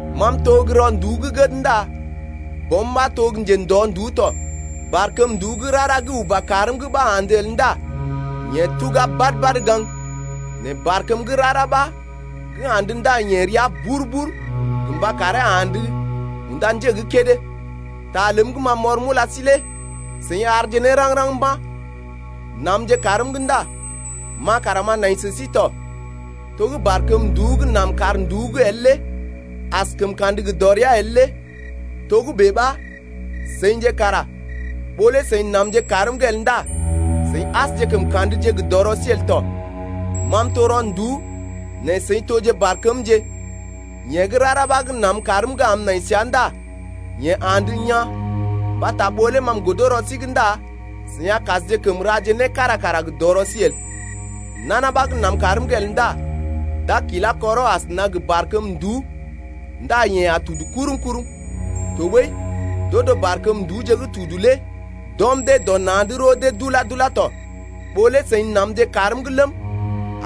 Ma m’to gə́ rɔ nduú gə́ gəd ndá Bɔm ɓa to gə́ njendɔ nduú tɔ. Barkəm nduú gə́ rara gə́ uba kaarm’g ɓa andə el ndá yeḛ tuga badə-badə gaŋg, nɛ barkəm gə́ rara ɓa gə́ andə ndá yeḛ rəa bur-bur gə mba karee andə unda njé gə́ kédé. Ta ləm gə́ ma m’ɔr m’ula sí lé seḭ àrje ne raŋg-raŋg mba̰. Namje kaarm’g ndá ma kara m’a nai sə sí tɔ. To gə́ barkəm nduú gə́ nam kaar nduú’g el lé askəm kandə gə dɔrea el lé togə́bè ɓa seḭje kara ɓó lé seḭ namje kaarm’g el ndá seḭ asje kəm ka̰dje gə dɔrɔ sí el tɔ. Ma m’to rɔ nduú, nɛ seḭ toje gə́ barkəmje. Yeḛ gə́ rara ɓa gə́ nam kaarm’g am m’nai səa ndá yeḛ andə yaa̰, mbata ɓó lé ma m’godo rɔ sí’g ndá seḭ a kasje kəm raje né kára kara gə dɔrɔ sí el. Nana ɓa gə́ nam kaarm’g el ndá d’a kilá kɔrɔ asəna gə barkəm nduú ndá yeḛ a tudu kurum-kurum. Tɔɓəi d’odo barkəm nduúje gə́ tudu lé d’ɔm dee dɔ na̰’d roo dee dula-dula tɔ. Ɓó lé seḭ namje kaarm’g ləm,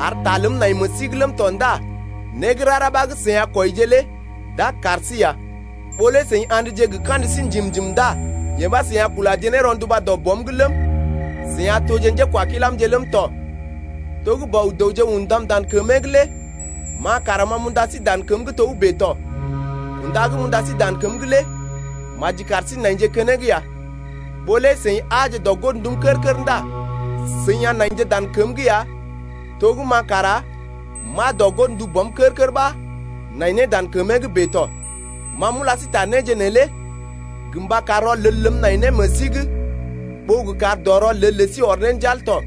ar ta ləm nai meḛ sí’g ləm tɔ ndá né gə́ rara ɓa gə́ seḭ a kwɔije lé d’a kar sí ya. Ɓó lé seḭ a̰dje gə kandə sí njim-njim ndá yee ɓa seḭ a kulaje ne rɔnduba dɔ Bɔm’g ləm, seḭ a toje njékwakilamje ləm tɔ. To gə́ Bɔ-dəwje undam dan kəmee’g lé ma kara ma m’unda sí dan kəm’g togə́bè tɔ. Kunda gə́ m’unda sí dan kəm’g lé maji kar sí naije keneŋ ya. Ɓó lé seḭ aaje dɔ godndum kər-kər ndá seḭ a naije dan kəm’g ya to gə́ ma kara m’aa dɔ godndu Bɔm kər-kər ɓa m’nai ne dan kəmee’g bèe tɔ. Ma m’ula sí ta néje neelé gə mba kar rɔlel ləm nai ne meḛ sí’g ɓó gə kar dɔ rɔlel lə sí ɔr ne njal tɔ.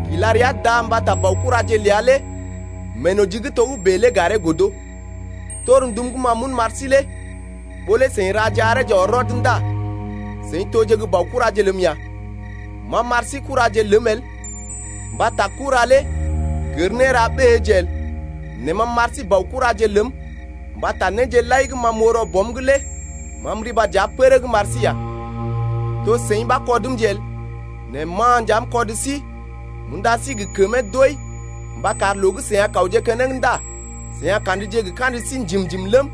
Kila rəa da mbata baokuraje ləa lé meenoji gə́ togə́bè lé garee godo. Torndum gə́ ma m’un m’ar sí lé ɓó lé seḭ raje areeje ɔr rɔd ndá seḭ toje gə́ baokuraje ləm ya. Ma m’ɓar sí kuraje ləm el mbata kura lé gər néra ɓéeje el. Nɛ ma m’ɓar sí baokuraje ləm mbata néje lai gə́ ma m’oo rɔ Bɔm’g lé ma m’riba dəa pərəg m’ar sí ya. To seḭ ɓa kɔdmje el, nɛ ma nja m’kɔd sí m’unda sí gə kəmee doi mba kar loo gə́ seḭ a kawje keneŋ ndá seḭ a ka̰dje gə kandə sí njim-njim ləm,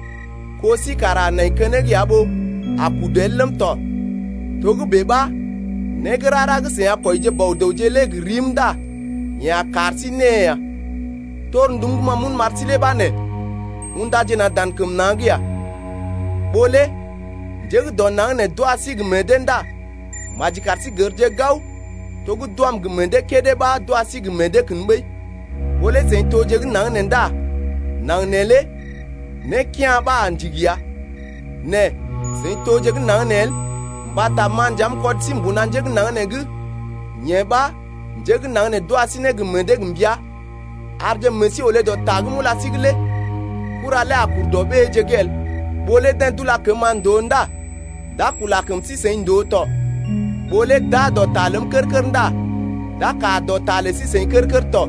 kó sí kara a nai keneŋ ya ɓó a kudu el ləm tɔ, togə́bè ɓa né gə́ rara gə́ seḭ a kwɔije Bɔ-dəwje lé gə rim ndá yeḛ a kar sí née ya. Torndum gə́ ma m’un m’ar sí lé ɓa nee: Undaje na̰ dan kəm na̰’d ya. Ɓó lé njé gə́ dɔ naŋg nee d’wa sí gə meḛ dee ndá maji kar sí gərje gao to gə́ d’wam gə meḛ dee kédé ɓa d’wa sí gə meḛ dee kən ɓəi. Ɓó lé seḭ toje gə́ naŋg nee ndá naŋg neelé né kea̰ ɓa a ndigi ya, nɛ seḭ toje gə́ naŋg nee el mbata ma nja ma m’kɔd sí mbuna njé gə́ naŋg nee’g, yee ɓa njé gə́ naŋg nee d’wa sí gə meḛ dee gə mbəa. Arje meḛ sí olé dɔ ta gə́ ma m’ula sí’g lé: Kura lé a kur dɔ ɓéeje’g el. Ɓó lé deḛ d’ula kəm-ma ndòo ndá d’a kula kəm sí-seḭ ndòo tɔ, ɓó lé d’aa dɔ ta ləm kər-kər ndá d’a kaa dɔ ta lə sí-seḭ kər-kər tɔ.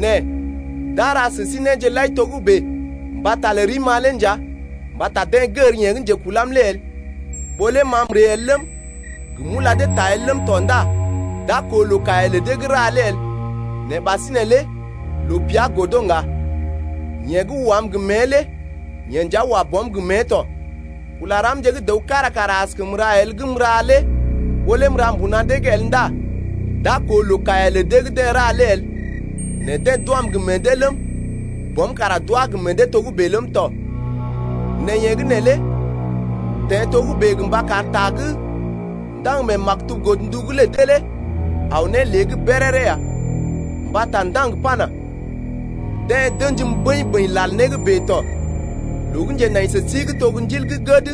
Nɛ d’a ra sə sí néje lai togə́bè mbata lə rim-ma lé nja mbata deḛ gər yeḛ gə́ njekulam lé el. Ɓó lé ma m’ree el ləm, gə m’ula dee ta el ləm tɔ ndá d’a koo loo kaiya lə dee gə́ ra lé el, nɛ ɓasinè lé loo pəa godo ŋga. Yeḛ gə́ wam gə mée lé yeḛ nja wa Bɔm gə mée tɔ. Kula ramje gə́ dəw kára kara askəm ra el gə́ m’ra lé ɓó lé m’ra mbuna dee’g el ndá d’a koo loo kaiya lə dee gə́ deḛ ra lé el, nɛ deḛ d’wam gə meḛ dee ləm, Bɔm kara d’wá gə meḛ dee togə́bè ləm tɔ. Nɛ yee gə́ neelé teḛ togə́bè gə mba kar ta gə́ ndaŋg mee maktub godndu’g lə dee lé aw ne lée’g béréré ya, mbata ndaŋg pana: Deḛ d’ə̰jim bəḭ-bəḭ lal né gə́ bèe tɔ. Loo gə́ njenai sə sí gə́ to Ndil gə́ gəd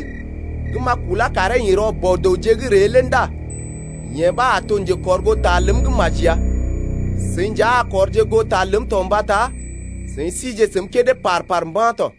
gə́ m’a kulá karee ḭ rɔ Bɔ-dəwje’g ree lé ndá yeḛ ɓa a to njekɔrgoota ləm gə́ maji ya. Seḭ nja seḭ a kɔrje goo ta ləm tɔ mbata seḭ sije səm kédé par-par mba̰ tɔ.